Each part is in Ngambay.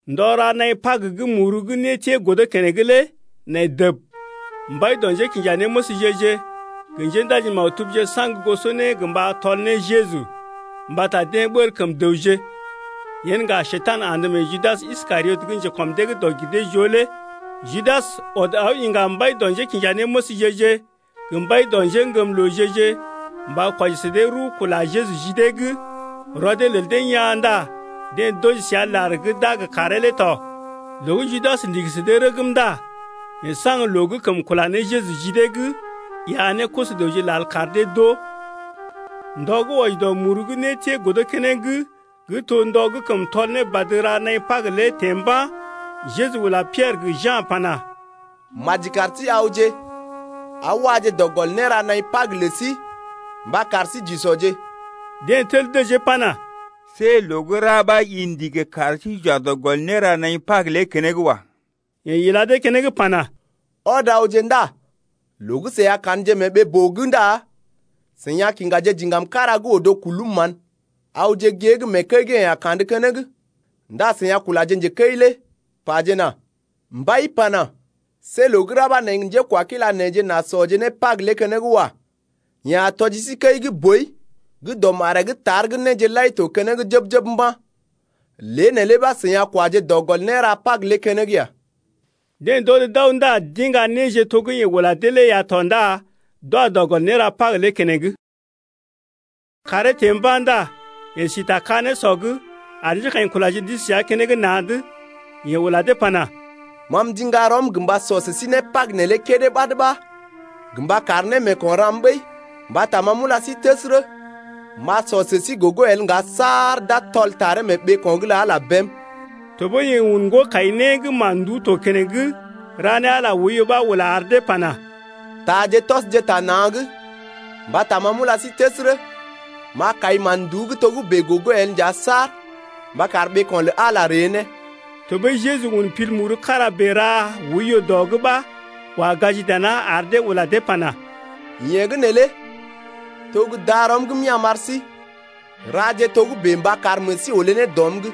Ndɔ ra naḭ Pag gə́ muru gə́ nétiee godo keneŋ lé nai dəb. Mbai dɔ njékinjanéməsje-je gə njéndaji-maktubje saŋg goso né gə mba tɔl ne Jeju, mbata deḛ ɓəl kəm dəwje. Yen ŋga Njekurai andə mee Judas Iskariot gə njekɔm dee gə́ dɔg-gir-dee-joo lé. Judas ɔd aw iŋga mbai dɔ njékinjanéməsje-je, gə mbai dɔ njéŋgəmlooje-je mba kwɔji sə dee rəw kula Jeju ji dee’g. Rɔ dee lel dee yaa̰ ndá deḛ d’wɔji səa lar gə́ d’a gə karee lé tɔ. Loo gə́ Judas ndigi sə dee rəgm ndá yeḛ saŋg loo gə́ kəm kula ne Jeju ji dee, iya ne koso-dəwje lal kar dee d’oo. Ndɔ gə́ wɔji dɔ muru gə́ nétiee godo keneŋ gə́ to ndɔ gə́ kəm tɔl ne badə ra naḭ Pag lé teḛ mba̰. Jeju ula Piɛrə gə Ja̰ pana: Maji kar sí awje aw waje dɔ gɔl néra naḭ Pag lə sí mba kar sí j’usɔje. Deḛ tel dəjee pana: See loo gə́ ra ɓa i ndigi kar sí j’wa dɔ gɔl néra naḭ Pag lé keneŋ wa. Yeḛ ila dee keneŋ pana: Ɔd awje ndá loo gə́ seḭ a ka̰dje mee ɓee-boo’g ndá seḭ a kiŋgaje diŋgam kára gə́ odo kulum mán. Awje gée’g mee kəi gə́ yeḛ a kandə keneŋ ndá seḭ a kulaje njekəi lé pajena: Mbai ulai pana: See loo gə́ ra ɓa neḛ gə njekwakila neḛje n’a sɔje né Pag lé keneŋ wa. Yeḛ a tɔji sí kəi gə́ boi gə́ dɔ maree’g tar gə́ néje lai to keneŋ jəb-jəb mba̰. Lée neelé ɓa seḭ a kwaje dɔ gɔl néra Pag lé keneŋ ya. Deḛ d’ɔd d’aw ndá d’iŋga néje to gə́ yeḛ ula dee lé ya tɔ ndá d’wa dɔ gɔl néra Pag lé keneŋ. Kàree teḛ mba̰ ndá yeḛ si ta ka-nésɔ’g ar njékaḭkulaje d’isi səa keneŋ na̰’d. Yeḛ ula dee pana: Ma m’ndiŋga rɔm gə mba sɔ sə sí né Pag neelé kédé ɓad ɓa gə mba kar némeeko̰ ram ɓəi. Mbata ma m’ula sí təsərə, m’a sɔ né sə sí gogo el ŋga saar d’a tɔl taree mee ɓeeko̰’g lə Ala bém. Tɔɓəi yeḛ un ŋgo-kai-né gə́ mán-nduú to keneŋ ra ne Ala oiyo ɓa ula ar dee pana: Taaje tɔsje ta na̰’g, mbata ma m’ula sí təsərə, m’a kai mán-nduú gə́ togə́bè gogo el nja saar mba kar ɓeeko̰ lə Ala ree ne. Tɔɓəi Jeju un pil muru kára bèe ra oiyo dɔ’g ɓa wa gaji dana ar dee ula dee pana: Yee gə́ neelé to gə́ darɔm gə́ m’ya̰ m’ar sí, raje togə́bè mba kar meḛ sí olé ne dɔm’g.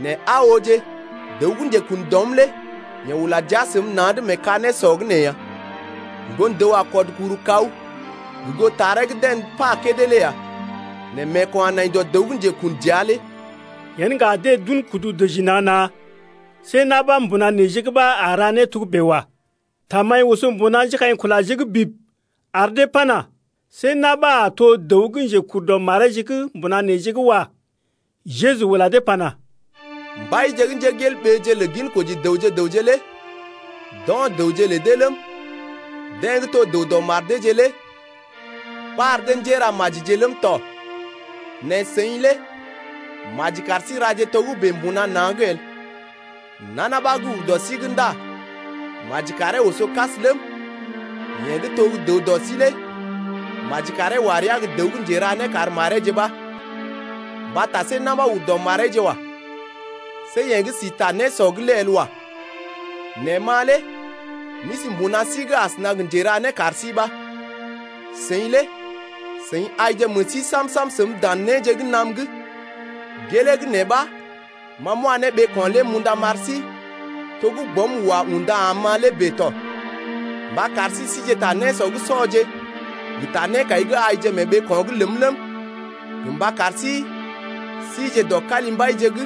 Nɛ aa ooje, dəw gə́ njekun dɔm lé yeḛ ula jia səm na̰’d mee ka-nésɔ’g nee ya. Ŋgon-dəw a kɔd kuru kaw gə goo taree gə́ deḛ pa kédé lé ya. Nɛ meeko̰ a nai dɔ dəw gə́ njekun dəa’g lé. Yen ŋga deḛ d’un kudu dəji na̰-na̰, see na̰ ɓa mbuna neḛje’g ɓa a ra né togə́bè ya. Tamaḭ oso bib mbuna njékaḭkulaje’g ar dee pana: See na̰ ɓa a to dəw gə́ njekur dɔ mareeje’g mbuna neḛje’g wa. Jeju ula dee pana: Mbaije gə́ njégelɓeeje lə ginkoji dəwje gə raŋg lé d’o̰ dəwje lə dee ləm, deḛ gə́ to dəw dɔ mar deeje lé ɓar dee njéramajije ləm tɔ. Nɛ seḭ lé maji kar sí raje togə́bè mbuna na̰’g el. Nana ɓa gə́ ur dɔ sí’g ndá maji karee oso kas ləm, yeḛ gə́ to gə́ dəw dɔ sí lé maji karee wa rəa gə́ dəw gə́ njera né kar mareeje ɓa. Mbata see na̰ ɓa ur dɔ mareeje wa. See yeḛ gə́ sí ta nésɔ’g lé el wa. Nɛ ma lé m’isi mbuna sí’g asəna gə njéra kar sí ɓa. Seḭ lé seḭ aije meḛ sí sam-sam səm dan néje gə́ naam’g, gelee gə́ nee ɓa ma m’wa ne ɓeeko̰ lé m’unda m’ar sí, to gə́ Bɔm wa unda am-ma lé bèe tɔ, mba kar sí sije ta nésɔ’g sɔje gə ta nékai’g aije mee ɓeeko̰’g ləm ləm, gə mba kar sí sije dɔ kalimbaije’g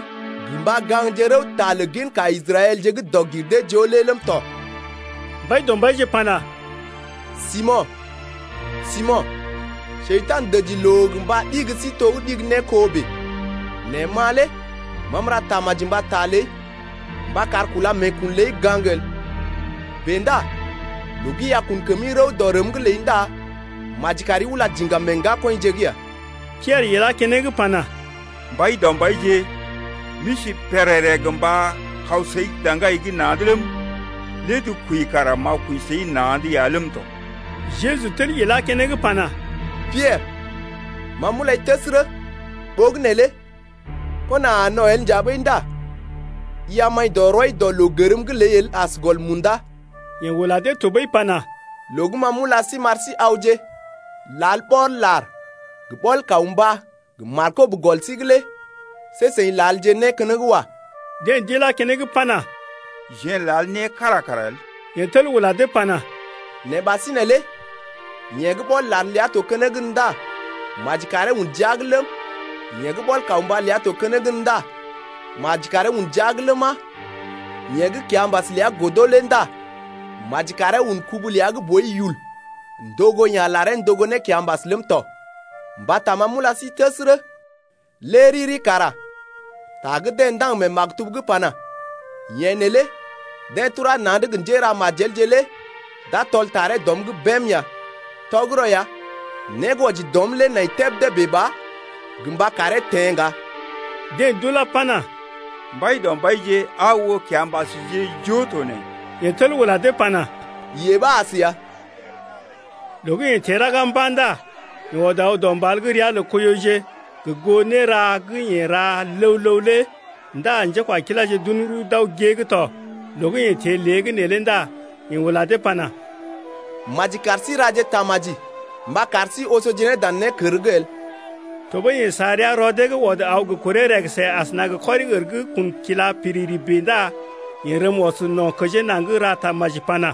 gə mba gaŋgje rəwta lə ginka Israɛlje gə́ dɔg-gir-dee-joo lé ləm tɔ. Mbaidɔmbaije pana: Simo̰, Simo̰, Njekurai dəji loo gə mba ɗigi sí to gə́ ɗigi ne kó bèe. Nɛ ma lé ma m’ra tamaji mbata ləi mba kar kúla meekun ləi gaŋg el. Bèe ndá loo gə́ i a kun kəmi rəw dɔ rəm’g ləi ndá maji kari ula diŋgam meḛ ŋgakɔḭje’g ya. Piɛrə ilá keneŋ pana: Mbaidɔmbaije, m’isi pèrèrè gə mba kaw səi daŋgai’g na̰’d ləm, lé’d kwəi kara m’a kwəi səi na̰’d ya ləm tɔ. Jeju tel ilá keneŋ pana: Piɛrə, ma m’ulai təsərə, ɓogənè lé kona a no̰ el nja ɓəi ndá i a maḭ dɔ rɔi dɔ loo gərm’g ləi el as gɔl munda. Yeḛ ula dee tɔɓəi pana: Loo gə́ ma m’ula sí m’ar sí awje lal ɓɔl-lar gə ɓɔl-kawmbá gə markob gə́ gɔl sí’g lé see seḭ lalje né keneŋ wa. Deḛ d’ilá keneŋ pana: Jeḛ n’lal né kára kara el. Yeḛ tel ula dee pana: Nɛ ɓasinè lé yeḛ gə́ ɓɔl-lar ləa to keneŋ gən ndá maji karee un jia’g ləm, yeḛ gə́ ɓɔl-kawmbá ləa to keneŋ gən ndá maji karee un jia’g ləma, yeḛ gə́ kiambas ləa godo lé ndá maji karee un kubu ləa gə́ boi yul ndogo ya̰ laree ndogo ne kiambas ləm tɔ. Mbata ma m’ula sí təsərə, lé riri kara ta gə́ deḛ ndaŋg mee maktub’g pana: Yeḛ neelé deḛ turá na̰’d gə njéramajelje lé d’a tɔl taree dɔm’g bém ya. Tɔgərɔ ya né gə́ wɔji dɔm lé nai tebdé bèe ba gə mba karee teḛ ŋga. Deḛ d’ulá pana: Mbaidɔmbaije, aa oo kiambasje joo to nee. Yeḛ tel ula dee pana: Yee ɓa as ya. Loo gə́ yeḛ teḛ raga mba̰ ndá yeḛ ɔd aw dɔ mbal gə́ ria lə Koiyoje gə goo néra gə́ yeḛ ra ləw-ləw lé ndá njékwakiláje d’un rəw d’aw gée’g tɔ. Loo gə́ yeḛ teḛ lée’g neelé ndá yeḛ ula dee pana: Maji kar sí raje tamaji mba kar sí osoje ne dan nékər’g el. Tɔɓəi yeḛ sa rəa rɔ dee’g ɔd aw gə kuree rəgəsə asəna gə kɔri-ər gə́ kun kila piriri bèe ndá yeḛ rəm ɔs no̰ kəjee naŋg ra tamaji pana: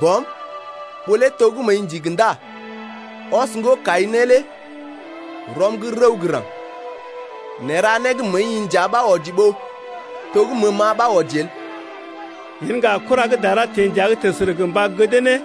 Bɔm, ɓó lé to gə́ məəi ndigi ndá ɔs ŋgo-kai-né lé rɔm’g rəw gə́ raŋg! Nɛ ra né gə́ məəi-i nja ɓa wɔji ɓó to gə́ məəm-ma ɓa wɔji el. Yen ŋga kura gə́ dara teḛ dəa’g təsərə gə mba gədee ne.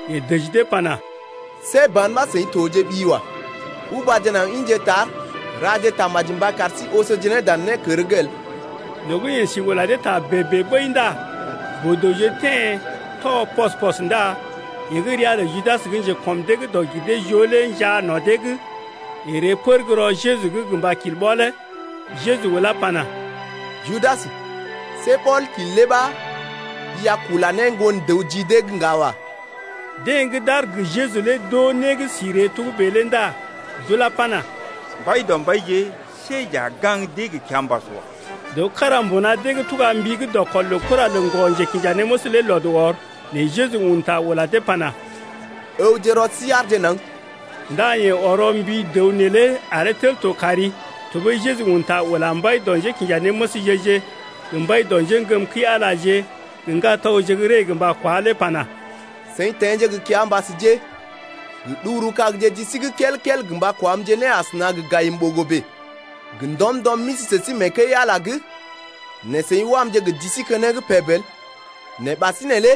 Yeḛ dəji dee pana: See ban ɓa seḭ tojeɓi wa. Ubaje naŋg ḭje tar raje tamaji mba kar sí osoje ne dan nékər’g el. Loo gə́ yeḛ si ula dee ta bèe-bèe ɓəi ndá boo-dəwje teḛ tɔ pɔs-pɔs, ndá yeḛ gə́ ria lə Judas gə́ njekɔm dee gə́ dɔg-gir-dee-joo lé njaa no̰ dee’g. Yeḛ ree pər gə́ rɔ Jeju’g gə mba kil ɓɔlee. Jeju ulá pana: Judas, see ɓɔl-kil lé ɓa i a kula ne Ŋgon-dəw ji dee’g ŋga wa. Deḛ gə́ d’aar gə Jeju lé d’oo né gə́ si ree togə́bè lé ndá d’ulá pana: Mbaidɔmbaije, see j’a gaŋg dee gə kiambas wa. Dəw kára mbuna dee’g tuga mbi gə́ dɔkɔl lə kura lə ŋgɔ-njekinjanéməs lé lɔd ɔr. Nɛ Jeju un ta ula dee pana: Ǝwje rɔ sí aarje naŋg! Ndá yeḛ ɔrɔ mbi dəw neelé aree tel to kari. Tɔɓəi Jeju un ta ula mbai dɔ njékinjanéməsje-je gə mbai dɔ njéŋgəm kəi-Alaje gə ŋgatɔgje gə́ ree gə mba kwá lé pana: Seḭ teḛje gə kiambasje gə ɗuguru-kagje ji sí’g kel-kel gə mba kwamje ne asəna gə gayim-ɓogo bèe. Gə ndɔm-ndɔm m’isi sə sí mee kəi-Ala’g nɛ seḭ wamje gə ji sí keneŋ peb el. Nɛ ɓasinè lé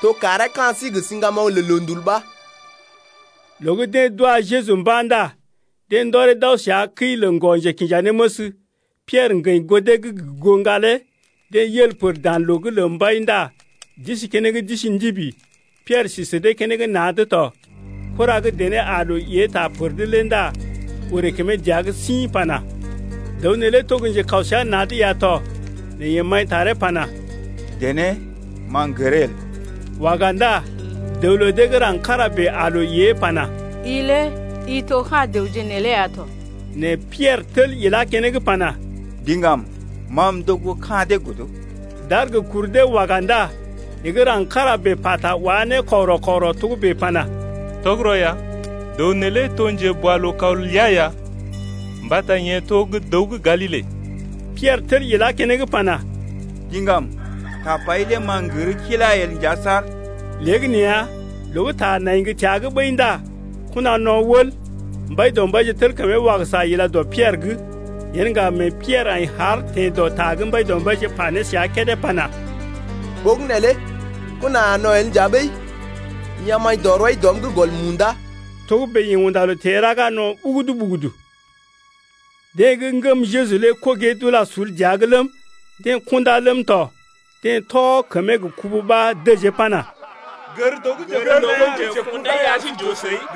to kàree ka̰ sí gə siŋgamoŋ lə loondul ɓa. Loo gə́ deḛ d’wa Jeju mba̰ ndá deḛ ndɔree d’aw səa kəi lə ŋgɔ-njekinjanéməs. Piɛrə ŋgəḭ goo dee’g gə goo ŋgalee. Deḛ yel pər dan loo’g lə mbai ndá d’isi keneŋ d’isi ndibi. Piɛrə si sə dee keneŋ na̰’d tɔ. Kura gə́ dené aa loo ée ta pər’d lé ndá orè kəmee dəa’g sḭ pana: Dəw neelé to gə́ njekaw səa na̰’d ya tɔ. Nɛ yeḛ maḭtaree pana: Dené, ma m’gəree el. Waga ndá dəw lə dee gə́ raŋg kára bèe aa loo ée pana: I lé i to ka̰ dəwje neelé ya tɔ. Nɛ Piɛrə tel ilá keneŋ pana: Diŋgam, ma m’to gə́ ka̰ dee el. D’aar gə kur dee waga ndá yeḛ gə́ raŋg kára bèe pata wa ne kɔgərɔ-kɔgərɔ togə́bè pana: Tɔgərɔ ya, dəw neelé to njeboalookaw ləa ya mbata yeḛ to gə́ dəw gə́ Galile. Piɛrə tel ilá keneŋ pana: Diŋgam, tapai lé ma m’gər kila el nja saar. Léegəneeya loo gə́ ta nai gə́ təa’g ɓəi ndá kona no̰ wəl. Mbaidɔmbaije tel kəmee wagəsa ila dɔ Piɛrə’g. Yen ŋga mee Piɛrə aḭ haar teḛ dɔ ta gə́ Mbaidɔmbaije pa ne səa kédé pana: Ɓogənè lé kona a no̰ el nja ɓəi i a maḭ dɔ rɔi dɔm’g gɔl munda. Togə́bè yeḛ unda loo teḛ raga no̰ ɓugudu-ɓugudu. Deḛ gə́ ŋgəm Jeju lé kogee d’ula sul dəa’g ləm, deḛ kundá ləm tɔ. Deḛ tɔ kəmee gə kubu ɓa dəjee pana: Gər dəw gə́ njekundai lé ar sí j’oo səi.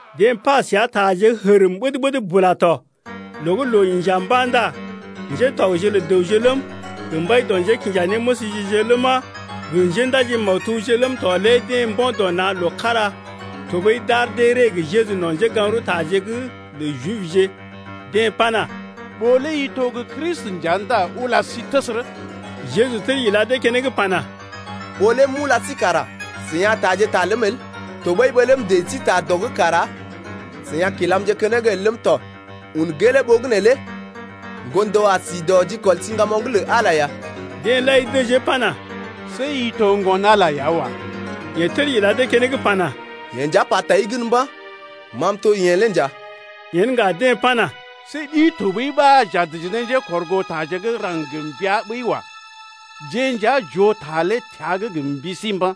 Deḛ pa səa taje gə́ hərm ɓəd-ɓəd bula tɔ. Loo gə́ loo inja mba̰ ndá ŋgatɔgje lə dəwje ləm, gə mbai dɔ njékinjanéməsje-je ləma, gə njéndaji-maktubje ləm tɔ lé deḛ mbo̰ dɔ na̰ loo kára tɔɓəi d’ar dee ree gə Jeju no̰ njégaŋ-rəwtaje’g lə Jibje. Deḛ pana: Ɓó lé i to gə́ Kristi nja ndá ula sí təsərə. Jeju tel ila dee keneŋ pana: Ɓó lé m’ula sí kara seḭ a taaje ta ləm el, tɔɓəi ɓó lé ma m’dəji sí ta dɔ’g kara seḭ a kilamje keneŋ el ləm tɔ. Un gelee ɓogənè lé Ŋgon-dəw a si dɔ jikɔl siŋgamoŋ’g lə Ala ya! Deḛ lai dəjee pana: See i to Ŋgon-Ala ya wa. Yeḛ tel ila dee keneŋ pana: Yeḛ nja pa ta sí gən mba̰, ma m’to yeḛ lé nja. Yen ŋga dee pana: See ɗi tɔɓəi ɓa j’a dəji ne njékɔrgootaje gə́ raŋg-raŋg gə mbəa ɓəi wa. Jeḛ nja j’oo ta lé təa’g gə mbi sí mba̰.